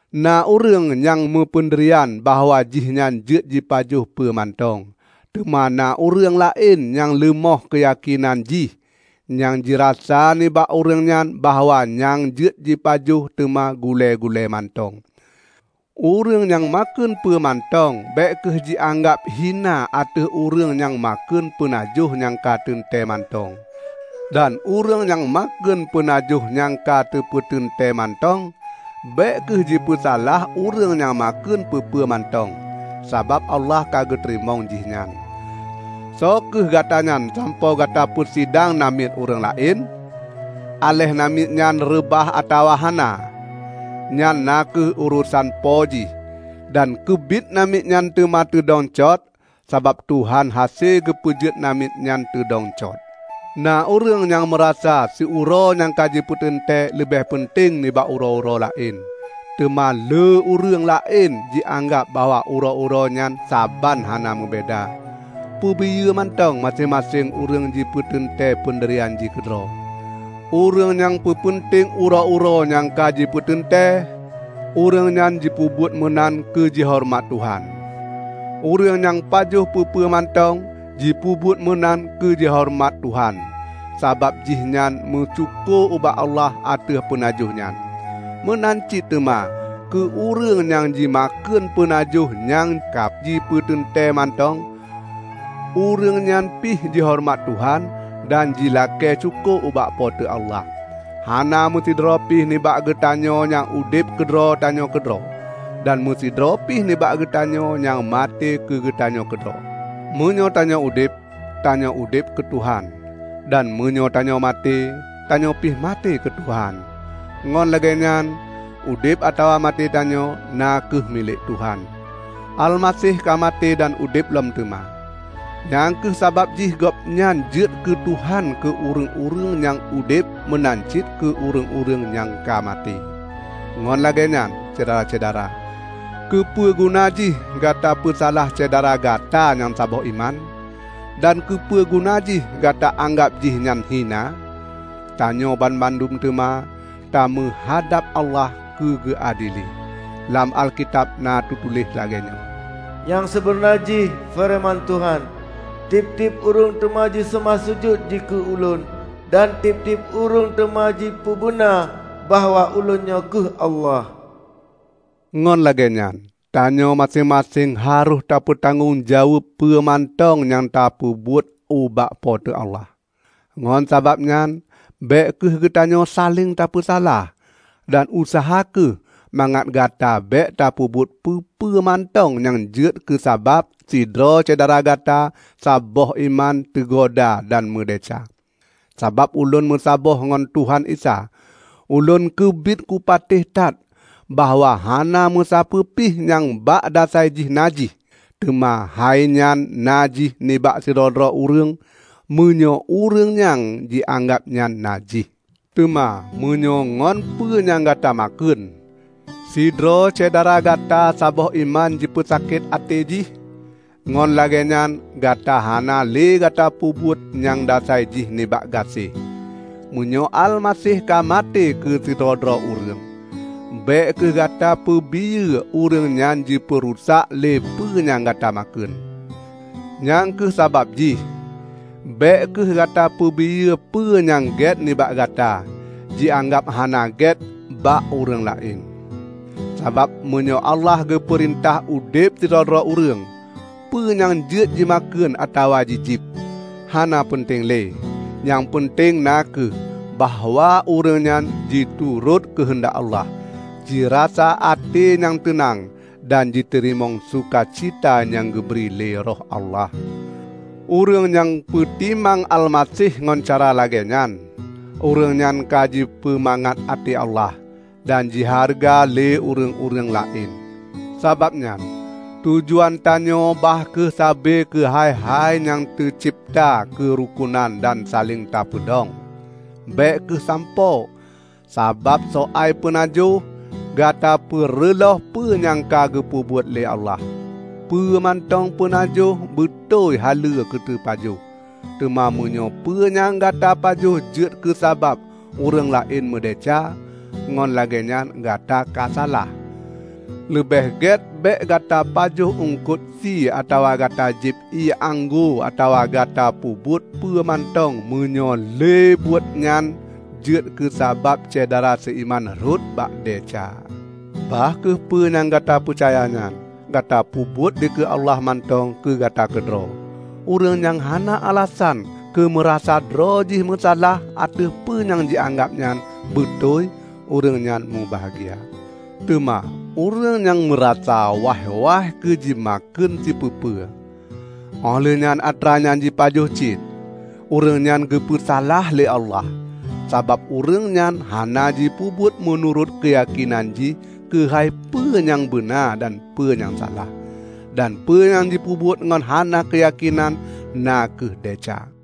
Na ureuëng nyang meupeundirian bahwa jihnyan jeuet jipajoh peue mantong. Teuma na ureuëng laén nyang leumoh keuyakénan jih; nyang jirasa nibak ureuëng nyan bahwa nyang jeuet jipajoh teuma gulée-gulée mantong. Ureuëng nyang makheun peue mantong bék kheueh jianggab hina ateueh ureuëng nyang makheun peunajoh nyang ka teuntée mantong; dan ureuëng nyang makheun peunajoh nyang ka teupeuteuntée mantong, bék kheueh jipeusalah ureuëng nyang makheun peue-peue mantong, sabab Allah ka geuteurimong jih nyan. Soe kheueh Gatanyan sampoe Gata peusidang namiet ureuëng laén? Aléh namiet nyan reubah atawa hana, nyan na kheueh urosan po jih. Dan keubiet namiet nyan teuma teudong cot, sabab Tuhan hase geupeujeuet namiet nyan teudong cot. Na ureuëng nyang meurasa siuroe nyang ka jipeuteuntée leubeh peunteng nibak uroe-uroe laén, teuma lé ureuëng laén jianggab bahwa uroe-uroe nyan saban hana meubeda. Peubiyeu mantong maséng-maséng ureuëng jipeuteuntée peundirian jih keudroe. Ureuëng nyang peupeunteng uroe-uroe nyang ka jipeuteuntée, ureuëng nyan jipeubuet meunan keu jihoreumat Tuhan. Ureuëng nyang pajoh peue-peue mantong, jipeubuet meunan keu jihoreumat Tuhan, sabab jih nyan meusyukoe ubak Allah ateueh peunajoh nyan. Meunan cit teuma keu ureuëng nyang jimakheun peunajoh nyang ka jipeuteuntée mantong; ureuëng nyan pih jihoreumat Tuhan dan jilakée syukoe ubak Po teu Allah. Hana meusidroe pih nibak geutanyoe nyang udeb keudroe tanyoe keudroe; dan meusidroe pih nibak geutanyoe nyang maté keugeutanyoe keudroe. Meunyoe tanyoe udeb, tanyoe udeb keu Tuhan. Dan meunyoe tanyoe maté, tanyoe pih maté keu Tuhan. Ngon lagée nyan, udeb atawa maté tanyoe na kheueh milék Tuhan. Almaseh ka maté dan udeb lom teuma. Nyang kheueh sabab jih Gobnyan jeuet keu Tuhan keu ureuëng-ureuëng nyang udeb meunan cit keu ureuëng-ureuëng nyang ka maté. Ngon lagée nyan, Syedara-syedara! Keupeue guna jih gata peusalah syedara gata nyang saboh iman? Dan keupeue guna jih gata anggab jih nyan hina? Tanyoe banmandum teuma tameuhadab Allah keu geuadili. Lam Alkitab na teutuléh lagée nyoe, "Nyang sibeuna jih," feureuman Tuhan, "tieb-tieb ureuëng teuma jiseumah sujut dikeue Ulôn; dan tieb-tieb ureuëng teuma jipeubeuna bahwa Ulôn nyoe kheueh Allah." Ngon lagée nyan tanyoe maséng-maséng harôh tapeutanggong jaweueb peue mantong nyang tapeubuet ubak Po teu Allah. Ngon sabab nyan bék kheueh geutanyoe saléng tapeusalah. Dan useuha kheueh mangat gata bék tapeubuet peue-peue mantong nyang jeuet keusabab sidroe syedara gata saboh iman teugoda dan meudesya. Sabab ulôn meusaboh ngon Tuhan Isa, ulôn keubiet kupatéh that bahwa hana meusapeue pih nyang bak dasai jih najih; teuma hai nyan najih nibak sidroe-droe ureuëng, meunyoe ureuëng nyang jianggab nyan najih. Teuma meunyoe ngon peue nyang Gata makheun, sidroe syedara gata saboh iman jipeusakét até jih, ngon lagée nyan Gata hana lé gata peubuet nyang dasai jih nibak gaséh. Meunyoe Almaseh ka maté keue sidroe-droe ureuëng, bék kheueh gata peubiyeu ureuëng nyan jipeurusak lé peue nyang Gata makheun. Nyang kheueh sabab jih bék kheueh gata peubiyeu peue nyang gét nibak gata, jianggab hana gét bak ureuëng laén. Sabab meunyoe Allah geupeurintah udeb sidroe-droe ureuëng, peue nyang jeuet jimakheun atawa jijieb, hana peunteng lé. Nyang peunteng na kheueh bahwa ureuëng nyan jiturot keuheundak Allah, jirasa até nyang teunang dan jiteurimong suka cita nyang geubri lé Roh Allah. Ureuëng nyang peutimang Almaseh ngon cara lagée nyan, ureuëng nyan ka jipeumangat até Allah, dan jihareuga lé ureuëng-ureuëng laén. Sabab nyan tujuan tanyoe bah kheueh sabe keu hai-hai nyang teucebta keurukonan dan saléng tapeudong. Bék kheueh sampoe, sabab soai peunajoh, Gata peureulôh peue nyang ka geupeubuet lé Allah. Peue mantong peunajoh beutôi haleue keuteupajoh; teuma meunyoe peue nyang Gata pajoh jeuet keusabab ureuëng laén meudesya, ngon lagée nyan Gata ka salah. Leubeh gét bék gata pajoh eungkot sie atawa gata jieb ié anggô atawa gata peubuet peue mantong meunyoe lé buet nyan jeuet keusabab syedara seuiman rhot bak desya. Bah kheueh peue nyang Gata peucaya nyan, Gata peubuet dikeue Allah mantong keu Gata keudroe. Ureuëng nyang hana alasan keumeurasa droe jih meusalah ateueh peue nyang jianggab nyan beutôi, ureuëng nyan mubahgia. Teuma ureuëng nyang meurasa waih-waih keu jimakheun sipeue-peue, óh lheueh nyan atra nyan jipajoh cit, ureuëng nyan geupeusalah lé Allah; sabab ureuëng nyan hana jipeubuet meunurot keuyakénan jih keuhai peue nyang beuna dan peue nyang salah. Dan peue nyang jipeubuet ngon hana keuyakénan na kheueh desya.